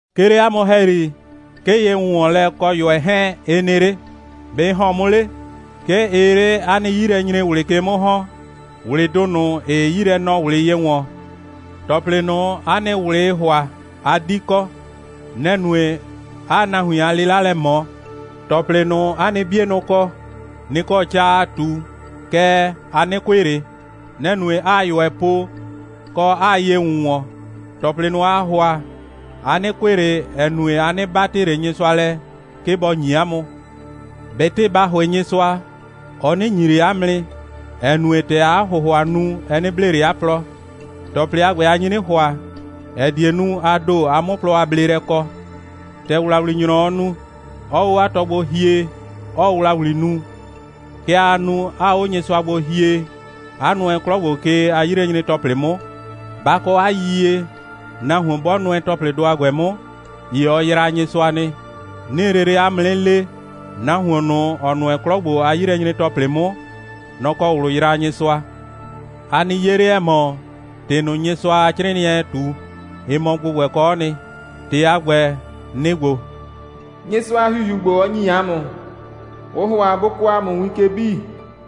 'Ke 'le 'a mʋ ‑hɛyri, 'ke ye‑wʋnwɔnlɛ kɔ ꞊yʋɛ 'hɛɛn, ɩ nɩ 'le. ‑Be' ɩ ‑hɔn 'mʋ 'le? 'Ke ɩɩ 'le 'a nɩ 'yilɛnyre꞊wlɩ ke 'mʋ ‑hɔn, ꞊wlɩdʋ ꞊nʋ, ‑ɩɩ 'yilɛnɔ꞊wlɩ ye ‑wɔn. ‑Tɔplɩ ꞊nʋ, 'a nɩ ꞊wlɩɩ ‑hʋa, a 'di kɔ. Nɛ‑ nue, 'aa nahuin a 'lɩla lɛ ꞊mɔ. ‑Tɔplɩ ꞊nʋ, 'a nɩ 'bienʋ kɔ, nɩ‑ kɔ ca aa ꞊tu, kɛɛ, a 'nɩ kʋɩ ꞊le. Nɛ‑ nue, 'aa ꞊yʋɛ po, kɔ, 'aa ye ‑wʋnwɔn. ‑Tɔplɩ ꞊nʋ, aa ‑hʋa, a 'nɩ kʋɩ ꞊le, ‑ɛ nue, a 'nɩ 'batɩ ꞊le Nyɩsʋa lɛ, 'ke bɔ ‑nyi 'a mʋ. ꞊Betɩ ba ‑hʋɩ Nyɩsʋa, ɔ 'nɩ ‑nyi ꞊le 'a mʋ nɩ, ‑ɛ nue, ‑tɛ aa 'a ‑hʋhʋa nu, ɛ 'nɩ blee ꞊le 'a plɔ. ‑Tɔplɩ a ‑gbɛ, a nyi 'nɩ ‑hʋa, ‑ɛ die nu, a ‑do, a 'mʋ plɔ a bleelɛ kɔ. ‑Tɛ ‑wlawlinyrɔɔ nu, 'ɔɔ 'o 'a tɔ gbo hie, 'ɔɔ ‑wlawli nu, kɛ aa nu, 'aa 'o Nyɩsʋa gbo hie, 'a nʋɛ 'klɔ ‑gbo ke a 'yilɛnyre‑tɔplɩ 'mʋ. Ba kɔ 'a yiyie, nahuon 'bɔ nʋɛ ‑tɔplɩdʋ a ‑gbɛ 'mʋ, ‑ye ɔ yraa Nyɩsʋa nɩ. 'Nɩɩ lele 'a mʋ 'nɩ le, nahuon ꞊nʋ, ‑ɔ nʋɛ 'klɔ ‑gbo a 'yilɛnyre‑tɔplɩ 'mʋ, nɔ‑ kɔ ꞊wlʋ yraa Nyɩsʋa. A nɩ 'ye 'le, ‑ɛ mɔ, ‑tɩ ꞊nʋ, Nyɩsʋa a 'crɩɩnɩɛɛ ꞊tu, ɩ mɔ ‑gbʋgbɛkɔɔ nɩ. ‑Tɩ a ‑gbɛ, nɩ‑ ‑gbo: «Nyɩsʋa a ‑Hihiu ‑gbo, ɔ ‑nyi ‑a mʋ, ʋʋ ‑hʋa bʋ kɔɔ ‑a mʋ win ke 'bii.»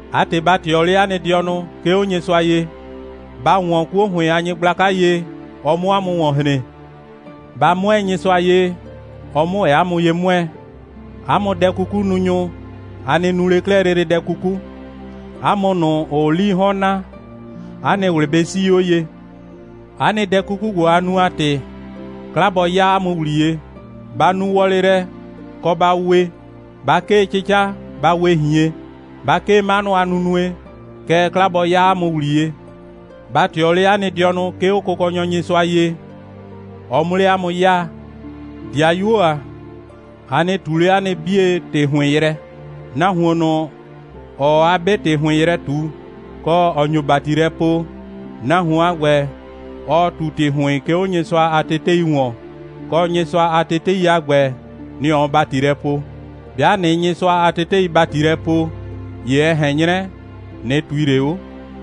'A ‑tɩ, ba ꞊tɩɔ 'le 'a nɩ dɩɔnʋ, 'ke 'o Nyɩsʋa ye. Ba ‑wɔn 'kuo ‑hʋɩn a nyɩgblaka ye, ɔ 'mʋ 'a mʋ ‑wɔn hren. Ba 'mʋɛɛ Nyɩsʋa ye, ɔ 'mʋ ‑wɛ 'a mʋ ye 'mʋɛɛ. 'A mʋ dɛ'kukununyʋ, a nɩ nu 'le 'klɛɛ lele dɛ 'kuku. 'A mʋ ꞊nʋ, ‑ʋʋ 'lii 'hɔn naa, 'a nɩ ꞊wlɩ bɩ 'sii 'o ye. 'A nɩ dɛ 'kuku ‑gbo, a nu a ‑tɩ, 'kla bɔ 'ya 'a mʋ ‑wliye. Ba nu wɔlɩ lɛ, kɔ ba we. Ba 'kee 'cɩca, ba we ꞊hien. Ba 'kee 'manʋ a nunue, kɛɛ, 'kla bɔ 'ya 'a mʋ ‑wliye. Ba ꞊tɩɔ 'le 'a nɩ dɩɔnʋ, 'ke 'o Kʋkɔnyɔ Nyɩsʋa ye, ɔ 'mʋ 'le 'a mʋ 'yaa. 'Dɩayuo ‑a, a nɩ ꞊tu 'le 'a nɩ 'bie ‑tɩ ‑hʋɩn yrɛ! Nahuon ꞊nʋ, ‑ɔɔ 'a 'be ‑tɩ ‑hʋɩn yrɛ ꞊tu, kɔ, ‑ɔ nyo ‑bati lɛ poo, nahuon a ‑gbɛ, ɔɔ ꞊tu ‑tɩ ‑hʋɩn, 'ke 'o Nyɩsʋa a tetei ‑wɔn, kɔ, Nyɩsʋa a tetei a ‑gbɛ, nɩ‑ ɔɔ ‑bati lɛ poo. 'Bɩa ꞊nɩɩ Nyɩsʋa a tetei ‑bati lɛ poo, ‑ye ɛ ꞊hɛn 'nyrɛ, ꞊nɩ ꞊tui ꞊le 'o,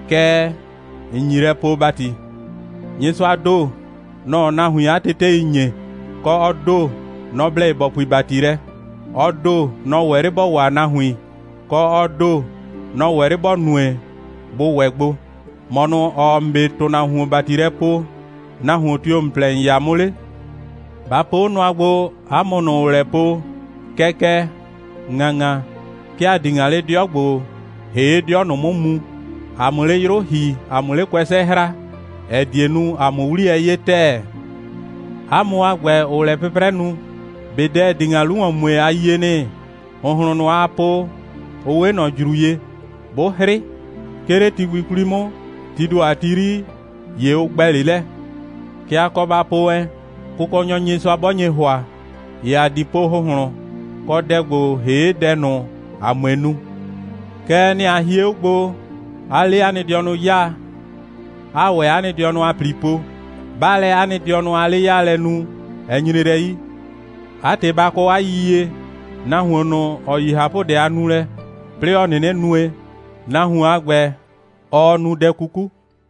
kɛɛ, ‑n nyi lɛ poo ‑bati. Nyɩsʋaa ‑do, nɔ‑ɔ nahuin 'a tetei ‑nye, kɔ, ɔ ‑do, nɔ‑ blɛ ye ‑bɔ pui ‑bati lɛ. Ɔ ‑do, nɔ‑ ‑wɛ 'le ‑bɔ waa nahuin, kɔ, ɔ ‑do, nɔ‑ wɛ 'le ‑bɔ nue, bʋ ‑wɛ gbo. ‑Mɔ ꞊nʋ, ‑ɔɔ ‑n 'be ‑tʋnahuon ‑bati lɛ poo, nahuon tio‑ ‑n plɛ ‑n 'ya 'mʋ 'le? Ba po 'o nʋa gbo, 'a mʋ ꞊nʋ, ‑ʋʋ lɛ po: «Kɛkɛ, ‑ŋaŋa, 'ke ‑a di ‑ŋa 'le 'dɩɔ ‑gbo ‑hee' 'dɩɔ ꞊nʋ 'mʋ mu, ‑a 'mʋ 'le 'yrʋ ‑hi, ‑a 'mʋ 'le kʋɛsɛ hra, ‑ɛ die nu, ‑a 'mʋ 'wliyɛ 'ye ‑tɛɛ.» 'A mʋ a ‑gbɛ, ‑ʋʋ lɛ 'pʋprɛ nu, ꞊be dɛ, ‑ɛ di ‑ŋa 'lu ‑wɔn mue, a yie nɩ? ‑Hʋnhlʋn ꞊nʋ, aa po, ʋ 'we ꞊nɔ ‑jru ye. 'Bʋ 'hrɩ, 'ke 'le ti gbi 'kwli 'mʋ, tii ‑do a ti 'yri, ‑ye ʋ ‑gbɛ 'le lɛ. Kɛ a kɔ ba po wɛn: «Kʋkɔnyɔ Nyɩsʋa 'bɔ nye ‑hʋa, ‑ye ‑a di po ‑hʋnhlʋn, kɔ, dɛ ‑gbo ‑hee' dɛ ꞊nʋ, ‑a 'mue nu.» Kɛɛ, nɛ‑ a hie 'o gbo, 'aa 'le 'a nɩ dɩɔnʋ 'yaa, 'aa ‑wɛ 'a nɩ dɩɔnʋ a ‑pli po. 'Baa lɛ 'a nɩ dɩɔnʋ a 'le'yaalɛ nu, ɛ nyre lɛ 'yi. 'A ‑tɩ, ba kɔ 'a yiyie, nahuon ꞊nʋ, ‑ɔ yi ꞊hapʋdɛ a nulɛ, 'plɩɩ ‑ɔ 'nɩnɩ nue, nahuon a ‑gbɛ, ɔɔ nu dɛ 'kuku.